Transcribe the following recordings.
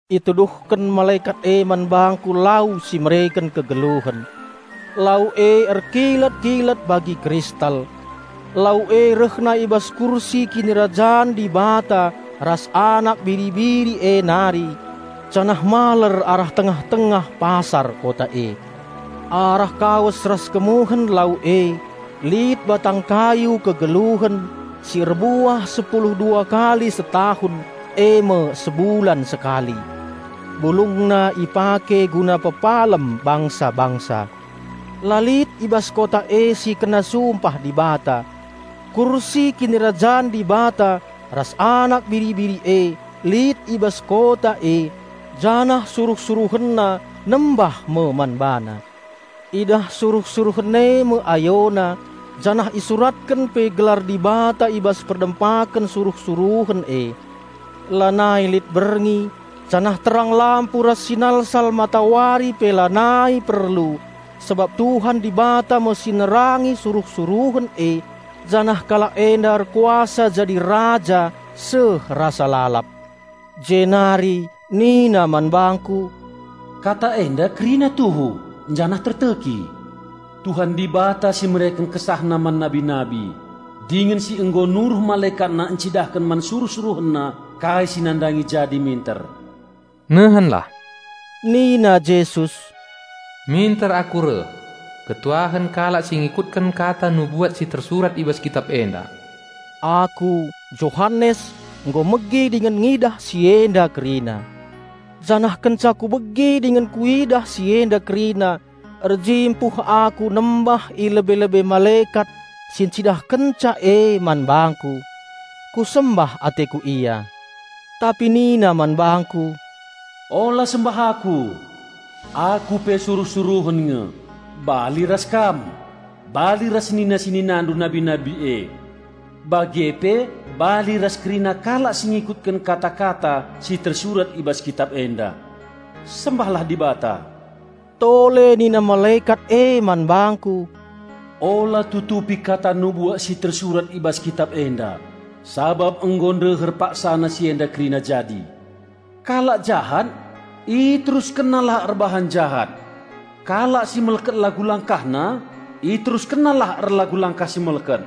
Ituduhken malekat e man bangku lau si mereken kegeluhen. Lau e erkilat-kilat bagi kristal. Lau e rehna i bas kursi Kinirajan Dibata ras Anak Biri-biri e nari, janah maler arah tengah-tengah pasar kota e. Arah kawes ras kemuhen lau e lit batang kayu kegeluhen, si erbuah sepulu dua kali setahun, e me sebulan sekali. Bulungna ipake guna pepalem bangsa-bangsa. La lit i bas kota e si kena sumpah Dibata. Kursi Kinirajan Dibata ras Anak Biri-biri e lit i bas kota e, janah suruh-SuruhenNa nembah me man BaNa. Idah suruh-suruhen e me AyoNa, janah isuratken pe gelar Dibata i bas perdempaken suruh-suruhen e. Lanai lit berngi, janah terang lampu ras sinalsal matawari pe lanai perlu sabap Tuhan Dibata me si nerangi suruh-suruhen e, janah kalak enda erkuasa jadi raja seh rasa lalap. Jenari nina man bangku, "Kata enda kerina tuhu, janah terteki. Tuhan Dibata si mereken KesahNa man nabi-nabi, dingen si nggo nuruh MalekatNa encidahken man suruh-SuruhenNa kai si nandangi jadi minter." "Nehenlah!" nina Yesus, "Minter Aku reh! Malem me ate kalak si ngikutken Kata nubuat si tersurat i bas Kitap enda!" Aku, Johanes, nggo megi dingen ngidah si enda kerina. Janah kenca kubegi dingen kuidah si enda kerina, erjimpuh aku nembah i lebe-lebe malekat si ncidahkenca e man bangku. Kusembah ateku ia. Tapi nina man bangku, "Ula sembah aku! Aku pe suruh-suruhen nge, bali ras kam, bali ras senina-seninandu nabi-nabi e; bage pe bali ras kerina kalak si ngikutken kata-kata si tersurat i bas Kitap enda. Sembahlah Dibata!" Tole nina malekat e man bangku, "Ula tutupi Kata nubuat si tersurat i bas Kitap enda, sabap nggo ndeher paksana si enda kerina jadi. Kalak jahat iteruskennalah erbahan jahat; kalak si melket lagu-langkahna iteruskennalah erlagu langkah si melket;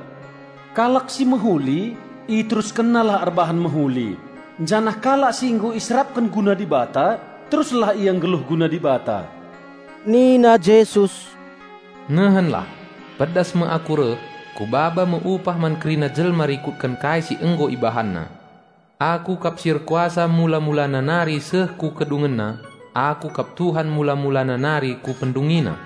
kalak si mehuli iteruskennalah erbahan mehuli janah kalak si nggo iserapken guna Dibata teruslah ia nggeluh guna Dibata." Nina Jesus, "Nehenlah! Pedas me Aku reh! Kubaba me upah man kerina jelma rikutken kai si nggo ibahanna. Aku kap si erkuasa mula-mulana nari seh ku kedungenna; Aku kap Tuhan mula-mulana nari ku pendungina."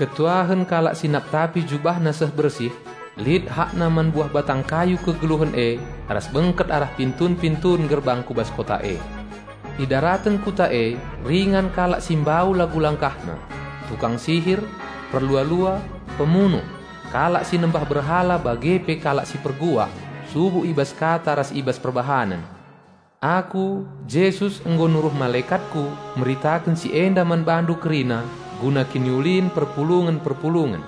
Malem me ate kalak si naptapi jubahna seh bersih. Lit hakna man buah batang kayu kegeluhen e ras bengket arah pintun-pintun gerbang ku bas kota e. Idaraten Kota e ringan kalak si mbau lagu langkahna, tukang sihir, perlua-lua, pemunuh, kalak si nembah berhala bage pe kalak si perbual subuk i bas kata ras i bas perbahanen. "Aku, Jesus, nggo nuruh malekatKu meritaken si enda man bandu kerina guna kiniulin perpulungen-perpulungen.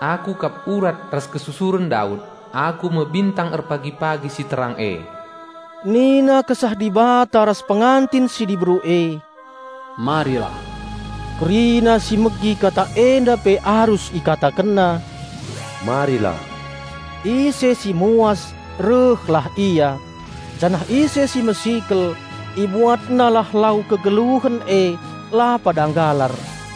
Aku kap urat ras kesusuren Daud; Aku me bintang erpagi-pagi si terang e." Nina Kesah Dibata ras Pengantin si Diberu e, "Marilah!" Kerina si megi kata enda pe arus ikatakenna, "Marilah!" Ise si muas rehlah ia! Janah ise si mesikel, ibuatnalah lau kegeluhen e, la pada nggalar.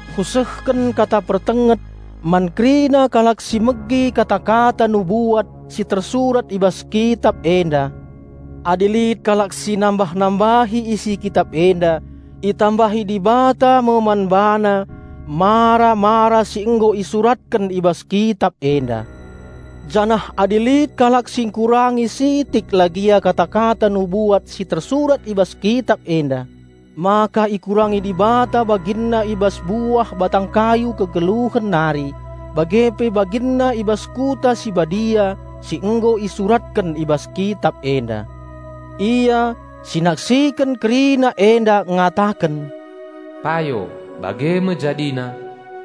Kusehken kata pertenget man kerina kalak si megi kata-kata nubuat si tersurat i bas kitap enda, "Adi lit kalak si nambah-nambahi isi kitap enda itambahi Dibata me man bana mara-mara si nggo isuratken i bas kitap enda. Janah adi lit kalak si ngkurangi sitik lah gia kata-kata nubuat si tersurat i bas kitap enda, maka ikurangi Dibata baginna i bas buah batang kayu kegeluhen nari, bage pe baginna i bas Kota si Badia si nggo isuratken i bas kitap enda." Ia, si naksiken kerina enda ngataken, "Payo, bage me jadina.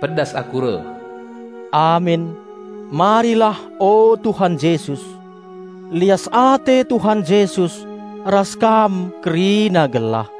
Pedas Aku reh!" Amin. Marilah, o Tuhan Jesus! Lias ate Tuhan Jesus ras kam kerina gelah.